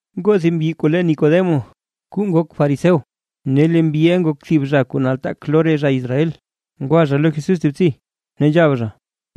Ngoo thib mbyi kuu le Nicodemo kuu nak fariseo, ne lee mbyiʼa nak thib zha kuu nataak lo re zha Israel. Thib btsi ngwa zha lo Jesús ne nzhab zha: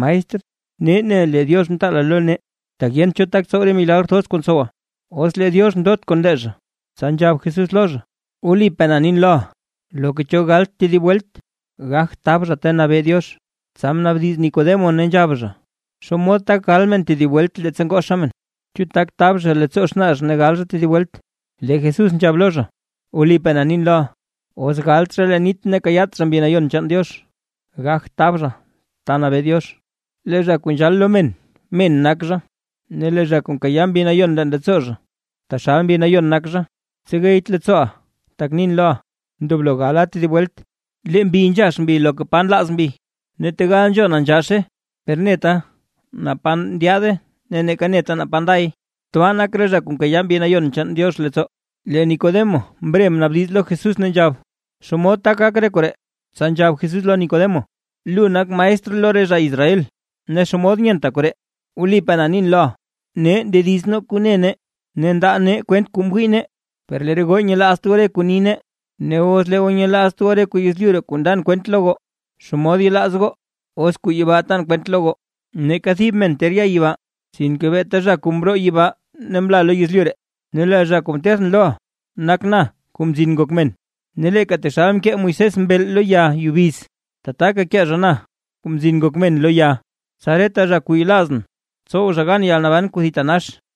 ―Maestr, nee ne lee Diox mtaala lo nee, tak yent cho tak tsow re milagr thoz kuu ntsowa, os lee Diox ndot kon lee zha. Tsa nzhab Jesús lo zha: ―Wlipaa na nin loʼa, loka cho galt tedib welt, gagt tab zha ta nabee Diox. Tsa mnaabdiz Nicodemo, ne nzhab zha: ―¿Xomod tak gal men tedib welt leettsa ngozha men? ¿Chu tak tab men leettsoo xnaa men ne gal men tedib welt? Lee Jesús nzhab lo zha: ―Wlipaa na nin loʼa, os galt zha leen nit ne kayaat zha Mbi Nayon chaan Diox, gagt tab zha ta nabee Diox. Lee zha kuu nzhal lo men, men nak zha, ne lee zha kuu nkayaa Mbi Nayon leen leettsoo zha, taxal Mbi Nayon nak zha. Tsegeyt leettsooʼa tak nin loʼa: “Ndoblo gala tedib welt.” Lee mbi nzhax mbi loka pa nlaaz mbi, ne tegal nzhona nzhaxe, per neta naa pa ndyaade ne neeka neta naa pa nday. Tbaa nak re zha kuu nkayaa Mbi Nayon chaan Diox leettsoo. Lee Nicodemo mre mnaabdiz lo Jesús ne nzhab: ―¿Xomod tak gak re koree? Tsa nzhab Jesús lo Nicodemo: ―¿Lu nak maestr lo re zha Israel, ne xomod nyenta koree? Wlipaa na nin loʼa, nee ndediz nee kuu ne nee, ne ndaa nee kwent kuu mwii nee, per lee re goo nyelaazt goo re kuu nii nee. Ne os lee goo nyelaazt goo re kuu yezlyu ree kuu ndan kwent lo goo, ¿xomod yelaaz goo os kuu yibaa tan kwent lo goo? ’Neeka thib men ter ya yibaa, sinke beeta zha kuu mroo yibaa ne mla lo yezlyu ree, ne lee zha kuu ntethʼn loʼa nak na, Kuu Mzin Ngok Men. Ne leeka taxalka mkee Moisés mbeel lo ya yubiz, tataka kee zha na, Kuu Mzin Ngok Men lo ya, tsa reta zha kuu yelaazʼn, tsow zha gan yalnaban kuu thitanax.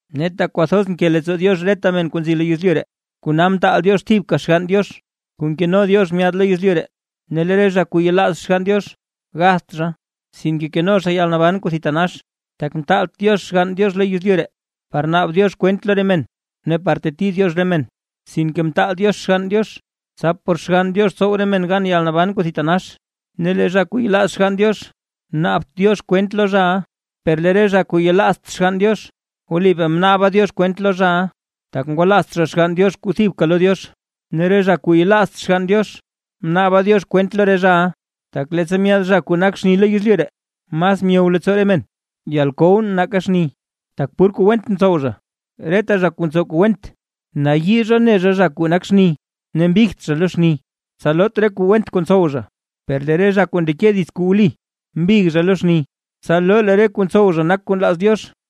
Ne tak kwathoz mke leettsoo Diox reta men kuu nzi lo yezlyu ree, kona mtaal Diox thibka Xgann Diox kuu nkeno Diox myaad lo yezlyu ree, ne lee zha kuu yelaaz Xgann Diox, gatht zha, sinke keno zha yalnaban kuu thitanax. Tak mtaalt Diox Xgann Diox lo yezlyu ree, par naab Diox kwent lo re men ne par teti Diox re men, sinke mtaal Diox Xgann Diox, tsa por Xgann Diox tsow re men gan yalnaban kuu thitanax. Ne lee zha kuu yelaaz Xgann Diox, naabt Diox kwent lo zhaʼa, per lee re zha kuu yelaazt Xgann Diox wlipaa mnaaba Diox kwent lo zhaʼa, tak ngwalaazt zha Xgann Diox kuu thibka lo Diox. Ne re zha kuu yelaazt Xgann Diox, mnaaba Diox kwent lo re zhaʼa, tak leettsa myaad zha kuu nak xni lo yezlyu ree, mas myow leettsoo re men yalkow nake xni, tak pur kuu went ntsow zha. Reta zha kuu ntsow kuu went, nayii zha ne zha zha kuu nak xni, ne mbigt zha lo xni, tsa loot re kuu went kuu ntsow zha. Per lee re zha kuu ndeke dits kuu wli, mbig zha lo xni, tsa loo lee re kuu ntsow zha nak kuu nlaaz Diox.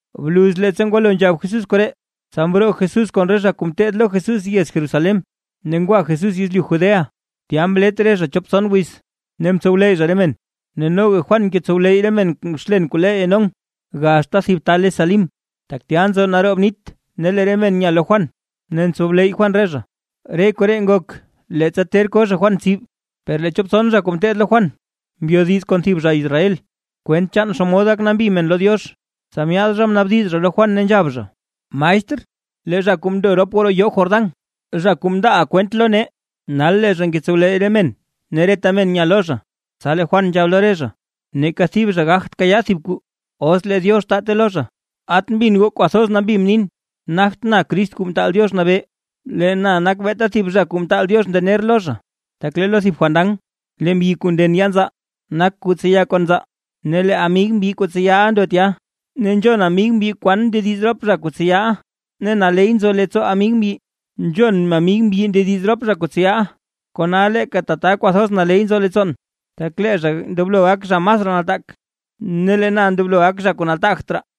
Bluz leettsa ngwalo nzhab Jesús koree, tsa mroo Jesús kon re zha kuu ngeteed lo Jesús yez Jerusalén, ne ngwa Jesús yezlyu Judea, tya mlet re zha chop tson wiz, ne mtsowleyy zha re men. Ne noga Juan ngetsowleyy re men xlen, kuu le Enón, gaxta thib ta le Salim, tak tya nzo naroob nit ne lee re men nya lo Juan, ne ntsowleyy Juan re zha. Re koree ngok, leettsa ter ko zha Juan tsib. Per lee chop tson zha kuu ngeteed lo Juan mndelo mbyodiz kon thib zha Israel, kwent chaan xomod gak nambi men lo Diox, tsa myaad zha mnaabdiz zha lo Juan ne nzhab zha: ―Maestr, lee zha kuu mndo rop goo roo yoo Jordán, zha kuu mndaaʼa kwent lo nee, nal lee zha ngetsowleyy re men, ne reta men nya lo zha. Tsa lee Juan nzhab lo re zha: ―Neeka thib zha gagt kayaa thib kwaa os lee Diox taate lo zha. At mbin goo kwathoz nambi mnin, nagtʼn Crist Kuu Mtaal Diox Nabee, lee na nak beeta thib zha kuu mtaal Diox ndener lo zha. Tak lee lo thib fandan, lee mbyi kuu nden yaa nzaa, nak kuu tseya kon nzaa, ne lee amig mbyi kuu tseyaʼa ndo tya, ne nzhon amig mbyi kwan ndediz rop zha kuu tseyaʼa, ne naley nzo leettsoo amig mbyi nzhon amig mbyi ndediz rop zha kuu tseyaʼa. Kona leeka tata kwathoz naley nzo leettsoon. Tak lee zha ndoblo gak zha masraa nataak, ne lee na ndoblo gakʼn zha kuu nataagt raa.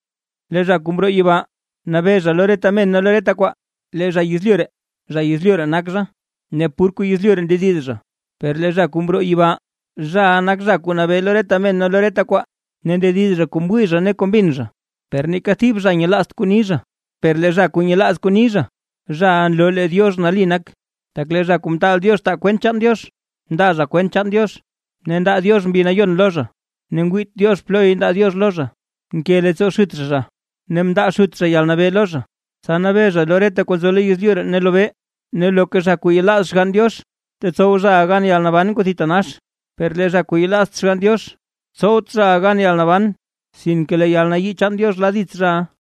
Lee zha kuu mroo yibaa nabee zha lo reta men ne lo reta kwaa. Lee zha yezlyu ree, zha yezlyu ree nak zha, ne pur kuu yezlyu ree ndediz zha. Per lee zha kuu mroo yibaa, zhaʼa nak zha kuu nabee lo reta men ne lo reta kwaa, ne ndediz zha kuu mwii zha ne kuu mbin zha, per neeka thib zha nyelaazt kuu ni zha. Per lee zha kuu nyelaaz kuu ni zha, zhaʼa nloo lee Diox nali nak. Tak lee zha kuu mtaal Diox taa kwent chaan Diox, ndaa zha kwent chaan Diox ne ndaa Diox Mbi Nayon lo zha, ne ngwiit Diox ploy ndaa Diox lo zha. Nke leettsoo Xut zha zha, ne mndaa Xut zha yalnabee lo Zha, tsa nabee zha reta kuu nzo lo yezlyu ree ne lobee. Ne loka zha kuu yelaaz Xgann Diox, tetsow zhaʼa gan yalnaban kuu thitanax, per lee zha kuu yelaazt Xgann Diox, tsowt zhaʼa gan yalnaban, sinke lee yalnayii chaan Diox la dits zhaʼa.